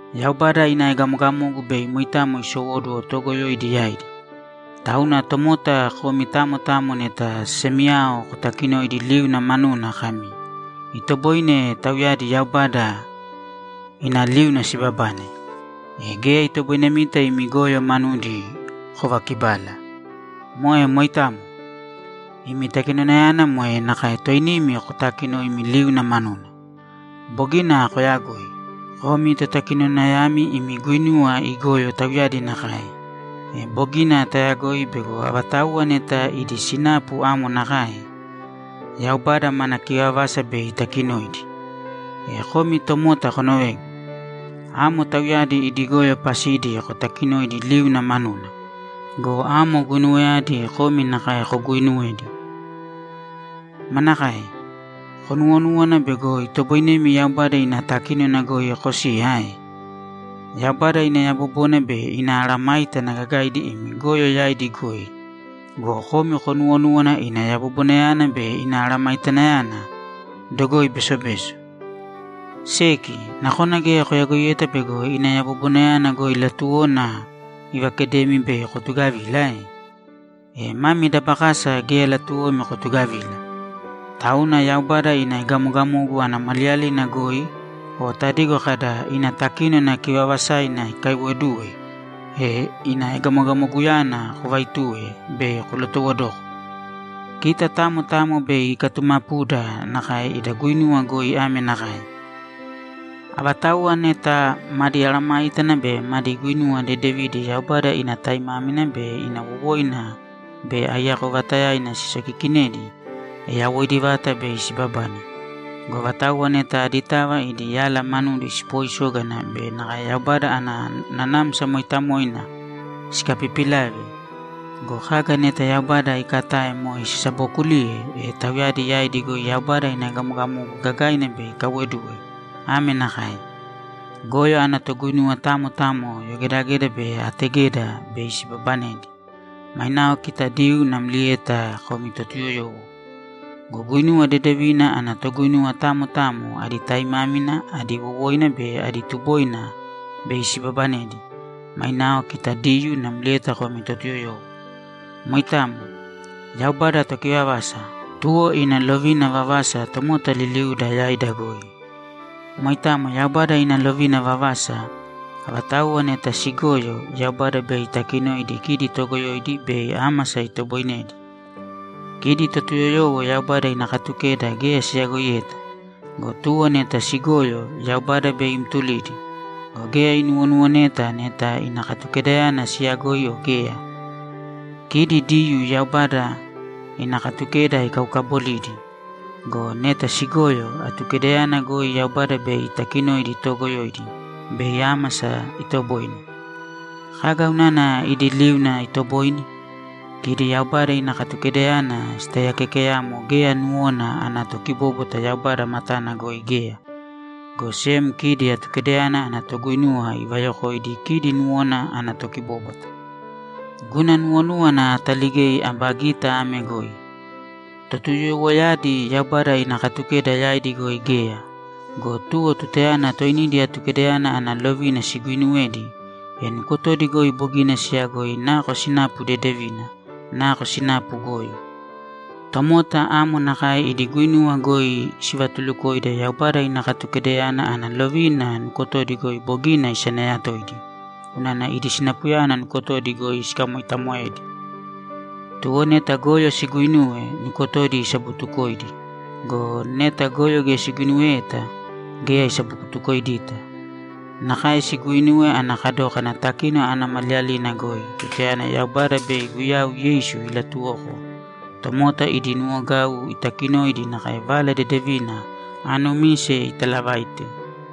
Yaubada ina egamogamogu bei moitamo isowóduwo toogoyoidi yaidi. Tauna tomota, komi tamo tamo neta semiyao kotakinoidi liuna manuna kami, ‘Itoboine tauyadi Yaubada ina liuna sibabane’, e geya itoboinemita imi goyo manudi kovakibala. Moe moitamo. Imi takinonayana moe nakae toinimi kotakinoimi liuna manuna. Bogina koyagoi. Komi totakinonayami imi guinuwa igoyo tauyadi nakae! E bogina tayagoi bego avatauwa neta idi sinapu amo nakae, Yaubada mana kivavasa bei itakinoidi. E komi tomota konovēgu. Amo tauyadi idi goyo pasidi kotakinoidi liuna manuna go, amo guinuwayadi komi nakae koguuinuwedi! Manakae? Konuwonúwana bego itoboinemi Yaubada ina takínona goi kosiya ae? Yaubada ina yabobona be ina mesayágana gagaidi imi goyo yaidi goi go, komi konuwonúwana ina yabobonayana be ina aramaitanayana dogoi besobeso. Seki, nakona geya koyagoiyeta bego ina yabobonayana goi latuwona ivakedemi bei kotugavila ae? E mami dabakasa geya latuwomi kotugavila, tauna Yaubada ina egamogamogu ana maliyalina goi o tadigo kada, ‘Ina takínona kivaavasaina ikaiwoduwe’, e ina egamogamoguyana kovaituwe bei kolotowodoko. Kita tamo tamo bei ikatumapuda nakae ida guinuwa goi ame nakae: Avatauwa neta madi mesayágana be madi guinuwa dedevidi Yaubada ina taimámina be ina wowoina be aiyako vata sisokiikinedi, e yawoidi vata bei sibabane. Go avatauwa neta aditava idi yala manudi sipoisógana be nakae Yaubada ana Nanamsa Mooitamoina sikapipilave go, kaga neta Yaubada iikatae moe sisabookuliye, e tauyadi yaidi goi Yaubada ina egamogamogu gagaina bei ikaiwoduwe ame nakae: Goyo ana toguinuwa tamo tamo yogedageda be ategeda bei sibabanedi; mainao kita Diyuu namlieta komi Totuyoyowo. Go guinuwa dedevina ana toguinuwa tamo tamo adi taimámina, adi wowoina be adi tuboina bei sibabanedi; mainao kita Diyuu namlieta komi Totuyoyowo. Moitamo. Yaubada tokivavasa, tuwo ina lovina vavasa tomota liliuda yaida goi. Moitamo Yaubada ina lovina vavasa. Avatauwa neta sigoyo, Yaubada bei itakinoidi kidi toogoyoidi bei ámasa itoboinedi. Kidi Totuyoyowo Yaubada ina Katukeda geya siyagoiyeta go, tuwo neta sigoyo, Yaubada bei imtulidi go, geya inuwonuwoneta neta ina Katukedayana siyagoi o geya. Kidi Diyuu Yaubada ina Katukeda ikaukabolidi go, neta sigoyo, Atukedayana goi Yaubada bei itakinoidi toogoyoidi bei ámasa itoboine. Kaga unana idi liuna itoboine? Kidi Yaubada ina Katukedayana sitaiyakeekeyamo geya nuwona ana tokibóbwata Yaubada matana goi geya, go sem kidi Atukedayana ana toguinuwa ivayokoidi kidi nuwona ana tokibóbwata. Guna nuwonúwana ataligei aba gita ame goi: Totuyoyowoyadi Yaubada ina Katukeda yaidi goi geya go, tuwo tutayana toinidi Atukedayana ana lovina siguinuwedi, e nukotodi goi bogina siyagoi nako sinapu dedevina, nako sinapu goyo. Tomota amo nakae idi guinuwa goi sivatulukoida Yaubada ina Katukedayana ana lovina nukotodi goi bogina isanayatoidi unana idi sinapuyadi nukotodi goi sikamoitamoedi. Tuwo neta goyo siguinuwe, nukotodi isabutukoidi go, neta goyo geya siguinuweyeta, geya isabutukoidita. Nakae siguuinuwe ana kadókana takínona ana maliyalina goi tutayana Yaubada bei Guyau Yeisu ilatuwoko tomota idi nuwogau itakinoidi nakae Vala Dedevina aanumise italavaite.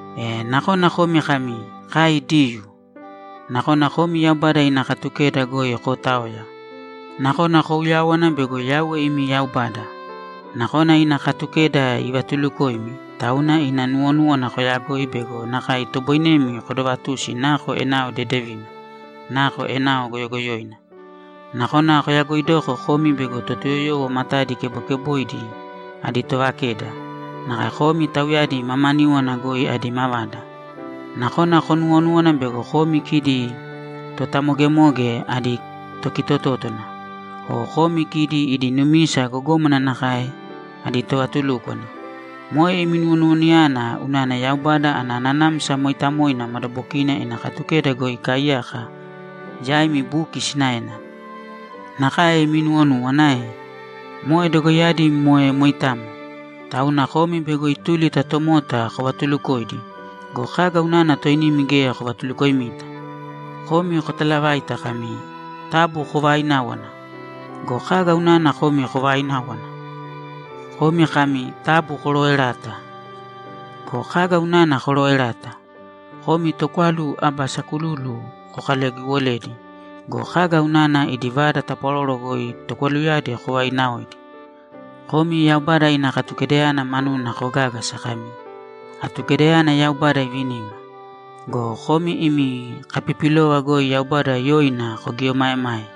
E nakona komi kami, ‘Kai Diyuu.’ Nakona komi Yaubada ina Katukeda goi kootaoya. Nakona kouyáwana bego Yauwe imi Yaubada. Nakona ina Katukeda ivatulukoimi, tauna ina nuwonúwana koyagoi be nakae itoboinemi kodovatusi nako enao dedevina, nako enao goyogoyoina. Nakona koyagoidoko komi bego Totuyoyowo matadi kebokeboidi adi tovakeda, nakae komi tauyadi mamaníwana goi adi mavada. Nakona konuwonúwana bego komi kidi totamogemoge adi tokitotótona, o komi kidi idi numisa gogómana nakae adi tovatulúkwana. Moe imi nuwonuwanayana unana Yaubada ana Nanamsa Mooitamoina madabokina ina Katukeda goi ikaaiyaka yaimi buki sinaena. Nakae imi nuwonúwana ae? Moe dogoiyadi moe moitamo. Tauna komi bego ituli ta tomotava kovatulukoidi go, kaga unana toinimi geya kovatulukoimita? Komi kotalavaita kami, ‘Taabu kovaaināwana.’ Go kaga unana komi kovaaináwana? Komi kami, ‘Taabu korooerāta.’ Go kaga unana korooerata? Komi tokwalu aba sakululu kokalagiwoledi go, kaga unana idi vada tapwaroro goi tokwaluyadi kovainaaoidi? Komi Yaubada ina Katukedayana manuna kogágasa kami, ‘Atukedayana Yaubada ivinima.’ Go komi imi kapipilova goi Yaubada yoina kogieomaemae!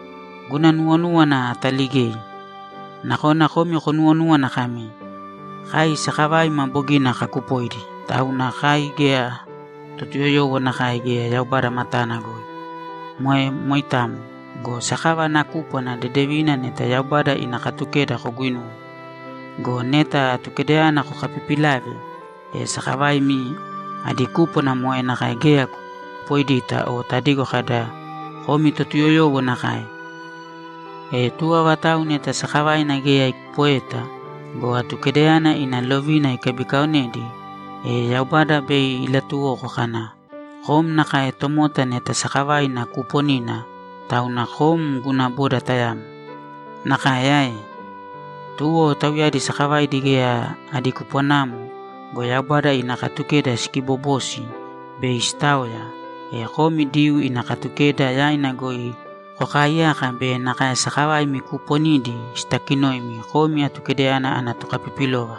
Guna nuwonúwana ataligei. Nakona komi konuwonúwana kami, ‘Kai sakavaima bogina kakupoidi, tauna kai geya Totuyoyowo nakae geya Yaubada matana goi.’ Moe moitamo. Go sakava ana kúpwana dedevina neta Yaubada ina Katukeda koguinuwe. Go neta Atukedayana kokapipilave, e sakavaimi adi kúpwana moe nakae geya kokupoidita o tadigo kada, ‘Komi Totuyoyowo nakae.’ E tuwo avatau neta sakavaina geya ikupoeta go, Atukedayana ina lovina ikabikaonedi, e Yaubada bei ilatuwoko kana, ‘Kom nakae tomota neta sakavaina kuuponina, tauna kom guna boda tayamo.’ Nakae ae? Tuwo tauyadi sakavaidi geya adi kupwanamo go, Yaubada ina Katukeda sikiibobosi bei sitaoya, e komi Diyuu ina Katukeda yaina goi kokaaiyaka be nakae sakavaimi kuuponidi sitakinoimi komi Atukedayana ana tokapipilova.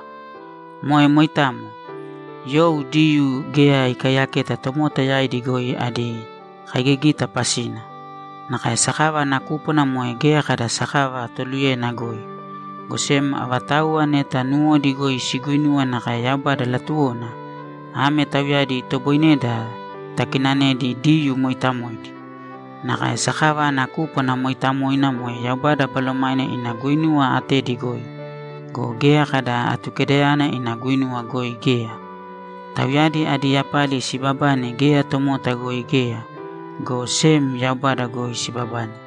Moe moitamo. You Diyuu geya ikaiyaketa tomota yaidi goi adi kaigigita pasina. Nakae sakava ana kúpwana moe geya kada sakava toluyena goi. Go sem avatauwa neta nuwodi goi siguinuwa nakae Yaubada latuwona, ame tauyadi itoboineda takinanedi Diyuu mooitamoidi. Nakae sakava ana kúpwana mooitamoina moe Yaubada Balomaina ina guinuwa atedi goi go, geya kada Atukedayana ina guinuwa goi geya. Tauyadi adi yapali siibabane geya tomota goi geya, go sem Yaubada goi sibabane.